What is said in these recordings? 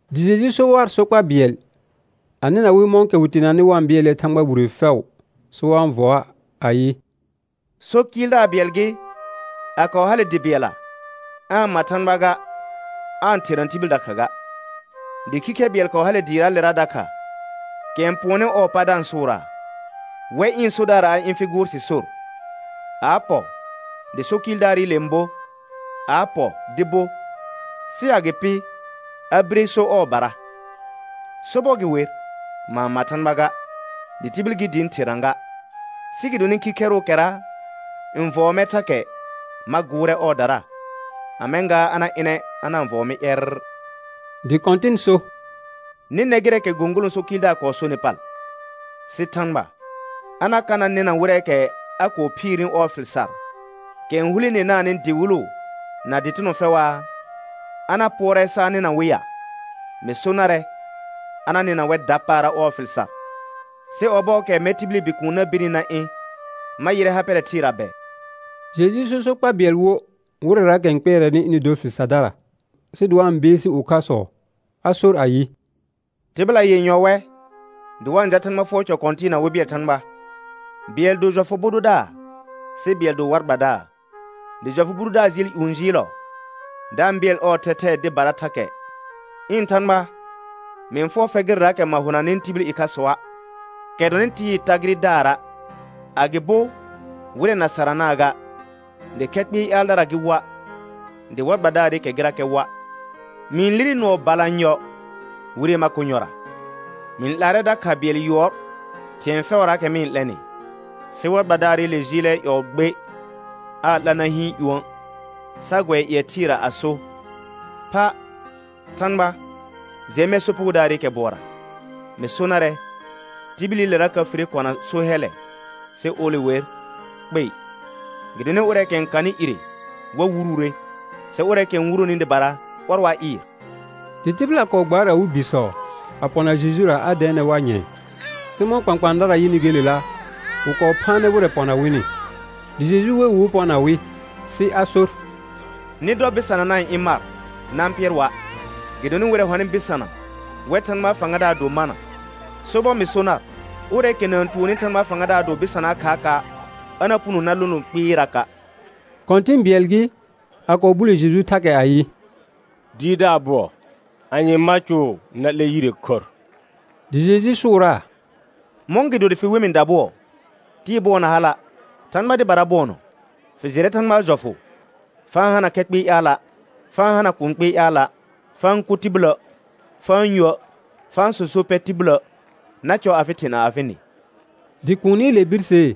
Dɩ Jeju so war sokpa bɩɛl, a nɩna wɩ mɔ̃kɛ wɩ teenanɩ wa-n bɩɛlnɛ Thãgba wire fɛʋ sɩ wa-n vɔa', ayɩ: So kɩɩldaar bɩɛl gɩ, a kɔɔ hale dɩ bɩɛlla. Aa-n ma Thãgba ga, aa-n therna tibil dakha ga. Dɩ khikhɛr bɩɛl kɔɔ hale dɩɩraalera dakha, kɛ n pʋɔnnɩ ɔɔ pa da-n sʋʋraa: Wɛ ɩ̃ sodaar a ɩ̃ fɩ gʋʋr sɩ sor. A a pɔ dɩ so kɩɩldaarɩle n bo, a a pɔ dɩ bo, sɩ agɩpɩ a bire so ɔɔbara: Sobɔr gɩ wer, ma-n ma Thãgba ga, dɩ tibil gɩ dɩ ɩ̃ therna ga. Sɩ gɩdonɩ khikhɛrʋʋkɛra n vɔɔ mɛr thakɛ, ma gʋʋrɛ ɔɔdara, a mɛ̃ gaa a na ɩnɛ a na-n vɔɔ mɩ ƴɛrr. Dɩ Kɔ̃tɩn so: Nɩ nɛ gɩrɛɛkɛ gõgolõ so kɩɩldaar kɔɔ sonɩ pal; sɩ Thãgba a na ka na nɩna wɩrɛɛkɛ a kɔɔ phiirni ɔɔ fɩl sar, kɛ n hulenenaanɩ dɩwɩlʋ na dɩtɩnɔ fɛʋaa? A na pʋɔrɛ sa a nɩna wɩ ya? Mɩ so narɛ a na nɩna wɛr dapaara ɔɔ fɩl sar. Sɩ ɔbɔɔkɛ mɛr tibili Bikuun na birni na ɩ̃, ma yɩrɛ ha pɛrɛ thɩɩra bɛ? Jeju sor sokpa bɩɛl wo wɩrɛraakɛ n kpɩɛrɛnɩ ɩnɩ dor fɩl sardara, sɩ dɩ wa-n beesi ʋkhasɔ, a sor ayɩ: Tɩbɩla yenyɔ wɛ, dɩ wa-n jal Thãgba fʋɔr cɔ kɔ̃tɩɩna wɩ bɩɛl Thãgba. Bɩɛl do jɔfʋ bʋ dʋdaar, sɩ bɩɛl do war gbadaar. Dɩ jɔfʋ bʋ dʋdaar jɩɩl ƴũ jɩɩlɔ da-n bɩɛl ɔɔ thɛthɛɛ dɩbara thakɛ: Ɩ̃ Thãgba, mɩ-n fʋɔr fɛr gɩrɛraakɛ ma honanɩ tibil ɩkhasɔa', kɛ dɔnɩ tɩɩ tagɩrɩdara', agɩbo wɩrɛ na saranaa ga, dɩ khɛ kpɩɩ ƴaaldara gɩ woa', dɩ war gbadaarɩkɛ gɩrakɛ woa'. Mɩ-n lire nʋɔ balanyɔ wire makonyɔra, mɩ-n 'laarɛ dakha bɩɛl yʋɔr thɩ̃ɛ fɛʋraakɛ mɩ n 'lɛnɩ. Sɩ war gbadaarɩle jɩɩlɛ ƴɔɔ gbe, aa 'la na hɩɩn ƴũə' sa gʋɛ ƴɩɛ thɩɩra a so: Pha Thãgba, jɛ mɛr sopugodaarɩkɛ bʋɔra. Mɩ so narɛ, tibililera ka fire kɔna so hɛllɛ, sɩ ole wer, kpei. Gɩdonɩ ʋrɛɛkɛ n kanɩ ire, wa wuruure, sɩ ʋrɛɛkɛ n wuroni dɩbara, ɔr wa ɩɩr. Dɩ tɩbɩla kɔɔ gbaar awɩ bisɔ a pɔna Jejura a dɛɛnɛ war nyɛ̃ɛ, sɩ mɔ̃ kpãkpãadara yɩnɩ gelela, wɩ kɔɔ phaanɛ wɩrɛ pɔna wɩnɩ. Dɩ Jeju we wɩ wɩ pɔna wɩ, sɩ a sor: Nɩ dɔ bɩsana na-n ɩ̃ mar na-n pɩɛr wa', gɩdonɩ wɩrɛ hɔnɩ bɩsana, wɛr Thãgbaa fãgadaar do mana. Sobɔr mɩ so nar, ʋrɛɛkɛ na-n tuonni Thãgbaa fãgadaar do bɩsanaa khaaka', a na puno na lono kpɩɩraka'. Kɔ̃tɩ̃ bɩɛl gɩ, a kɔɔ bule Jeju thakɛ ayɩ: Dɩɩrdaar bʋɔ, anye ma cʋʋ na 'lɛ yire khorr? Dɩ Jeju sʋʋraa: Mɔ̃gɩdo dɩ fɩ we mɩ dabʋɔ? Tɩɩ bʋɔ na hala', Thãgba dɩbara bʋɔnɔ. Fɩ jɩrɛ Thãgbaa jɔfʋ: «Fa-n hana khɛ kpɩɩ ƴaala', fa-n hana kũu kpɩɩ ƴaala', fa-n kʋ tibilə', fa-n yuə', fa-n sõso pɛ tibilə', na cɔ afɩ thɩ na afɩ nɩ.» Dɩ kuunile birsee: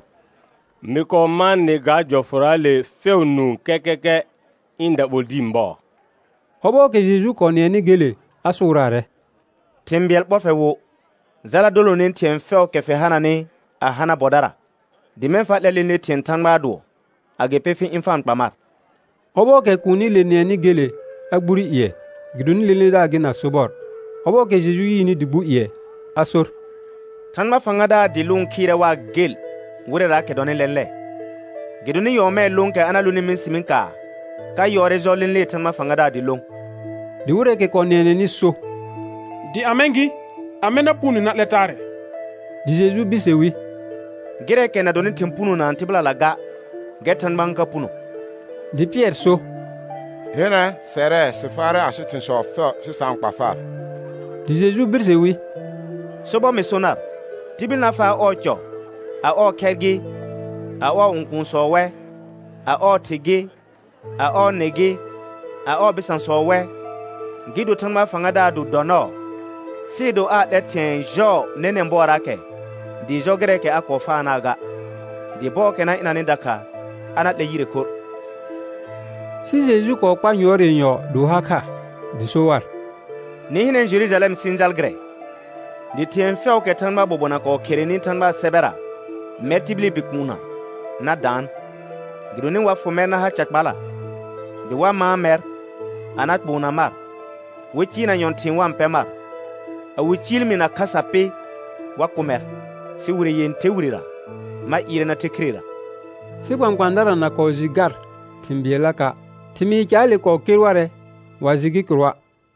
Mɩ kɔɔ mãa nɩ ga jɔfʋraale fɛʋ nũu kɛkɛkɛ ɩ̃ daɓol dĩi bɔɔ. Ɔbɔɔkɛ Jeju kɔɔ nɩɛnɩ gele a sʋʋraarɛ: Thɩ̃ bɩɛl ɓɔr fɛr wo. Jala dolone thɩ̃ɛ fɛʋʋkɛ fɩ hananɩ a hana bɔdara, dɩ mɛ̃ fa 'lɛ lẽle thɩ̃ɛ Thãgbaa dʋɔ, agɩpɩ fɩ ɩ̃ fa-n kpa mar. Ɔbɔɔkɛ kuunile nɩɛnɩ gele a gbure ƴɩɛ, gɩdonɩ lẽledaar gɩ na sobɔr. Ɔbɔɔkɛ Jeju yɩɩnɩ dɩ gbu ƴɩɛ a sor: Thãgba fãgadaar dɩ lʋʋn khɩɩrɛ waa gel wɩrɛraakɛ dɔnɩ lɛ̃lɛ. Gɩdonɩ nyɔɔmɛɛ lõokɛ a na lonɩ mɩsɩmɩ kaar ka yɔɔrɛ jɔ lẽlee Thãgba fãgadaar dɩ lõ. Dɩ wɩrɛɛkɛ kɔɔ nɩɛnɛnɩ so: Dɩ a mɛ̃ gɩ, amɛ na punone na 'lɛ taarɛ? Dɩ Jeju birse wi: Gɩrɛɛkɛ na dɔnɩ thɩ̃ punonaa tɩbɩlala ga, gɛr Thãgba n ka puno. Dɩ Pɩɛr so: Hɩnɛ, sɛrɛ sɩ faarɛ asɩ thɩ̃sɔ fɛʋ sɩ sa-n kpa far. Dɩ Jeju birse wi: Sobɔr mɩ so nar, tibil na faa ɔɔ cɔ, a ɔɔ khɛr gɩ, a ɔɔ õkuunsɔ wɛ, a ɔɔ thɩ gɩ, a ɔɔ nɩ gɩ, a ɔɔ bɩsãsɔ wɛ, gɩ do Thãgbaa fãgadaar do dɔ nɔɔ, sɩɩ do aa 'lɛ thɩ̃ɛ jɔɔ nɛnɛ̃ bɔɔraakɛ dɩɩ jɔ gɩrɛɛkɛ a kɔɔ faanaa ga, dɩ bɔɔkɛ na ɩnanɩ dakha a na 'lɛr yire khorr. Sɩ Jeju kɔɔ kpar yʋɔr yenyɔ dɩ wɩ ha kha, dɩ so war: Nɩ hɩnɛ Jerujalɛm sɩ-n jal gɩrɛ, dɩ thɩ̃ɛ fɛʋʋkɛ Thãgbaa bobona kɔɔ kherenɩ Thãgbaa sɛbɛra mɛr tibili Bikuunna na daan. Gɩdonɩ wa fʋ mɛr na ha ca kpala, dɩ wa mãa mɛr a na kpoona mar, wɩ cɩɩrna nyɔ̃thɩ̃ɩ wa-n pɛ mar. A wɩ ciil mi na khasa pɩ, wa kʋ mɛr. Sɩ wire yẽther wirera ma ɩɩrɛ na the khirera. Sɩ kpãkpãadara na kɔɔ jɩ gar thɩ̃ bɩɛllaka'. Thɩmɩɩ caale kɔɔ ker warɛ, wa jɩ gɩ kɩrʋa'.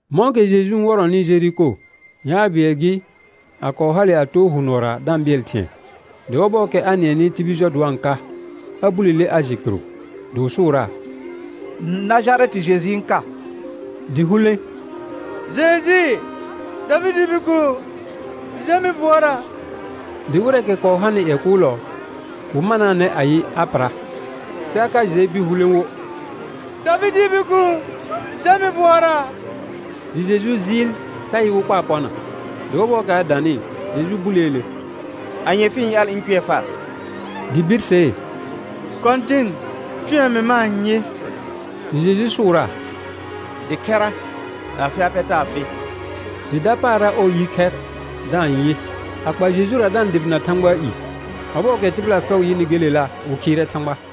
Mɔ̃kɛ Jeju n wɔrɔnɩ Jeriko, yaar bɩɛl gɩ, a kɔɔ hale a too hʋ nʋɔra da-n bɩɛl thɩ̃ɛ. Dɩ ɔbɔɔkɛ a nɩɛnɩ tibil jɔ dɩ wa-n ka, a bulele a jɩ kɩrʋ. Dɩ wɩ sʋʋraa: Najarɛtɩ Jeju n ka. Dɩ hulẽ: Jeju, Davɩdɩɩ Bikuun, jɛ mɩ bʋɔra. Dɩ wɩrɛɛkɛ kɔɔ hanɩ ƴɛ kʋʋlɔ, wɩ manaanɛ ayɩ a pɩra, sɩ a ka jɩɛ bir hulẽ wo: Davɩdɩɩ Bikuun, jɛ mɩ bʋɔra. Dɩ Jeju jɩɩl sa yɩ wɩ kpaa pɔna. Dɩ ɔbɔɔkɛ a danɩ, Jeju buleele: Anye fɩ-n ƴaal ɩ̃ cʋɛ far? Dɩ birsee: Kɔ̃tɩn, cʋɛ mɩ ma-n yɩ. Dɩ Jeju sʋʋraa: Dɩ khɛra, afɩ ha pɛ taa fɩ. Dɩ dapaara ɔɔ yi khɛr da-n yɩ, a kpa Jejura da-n dʋbɩna Thãgbaa i. Ɔbɔɔkɛ tɩbɩla fɛʋ yɩnɩ gelela wɩ khɩɩrɛ Thãgba.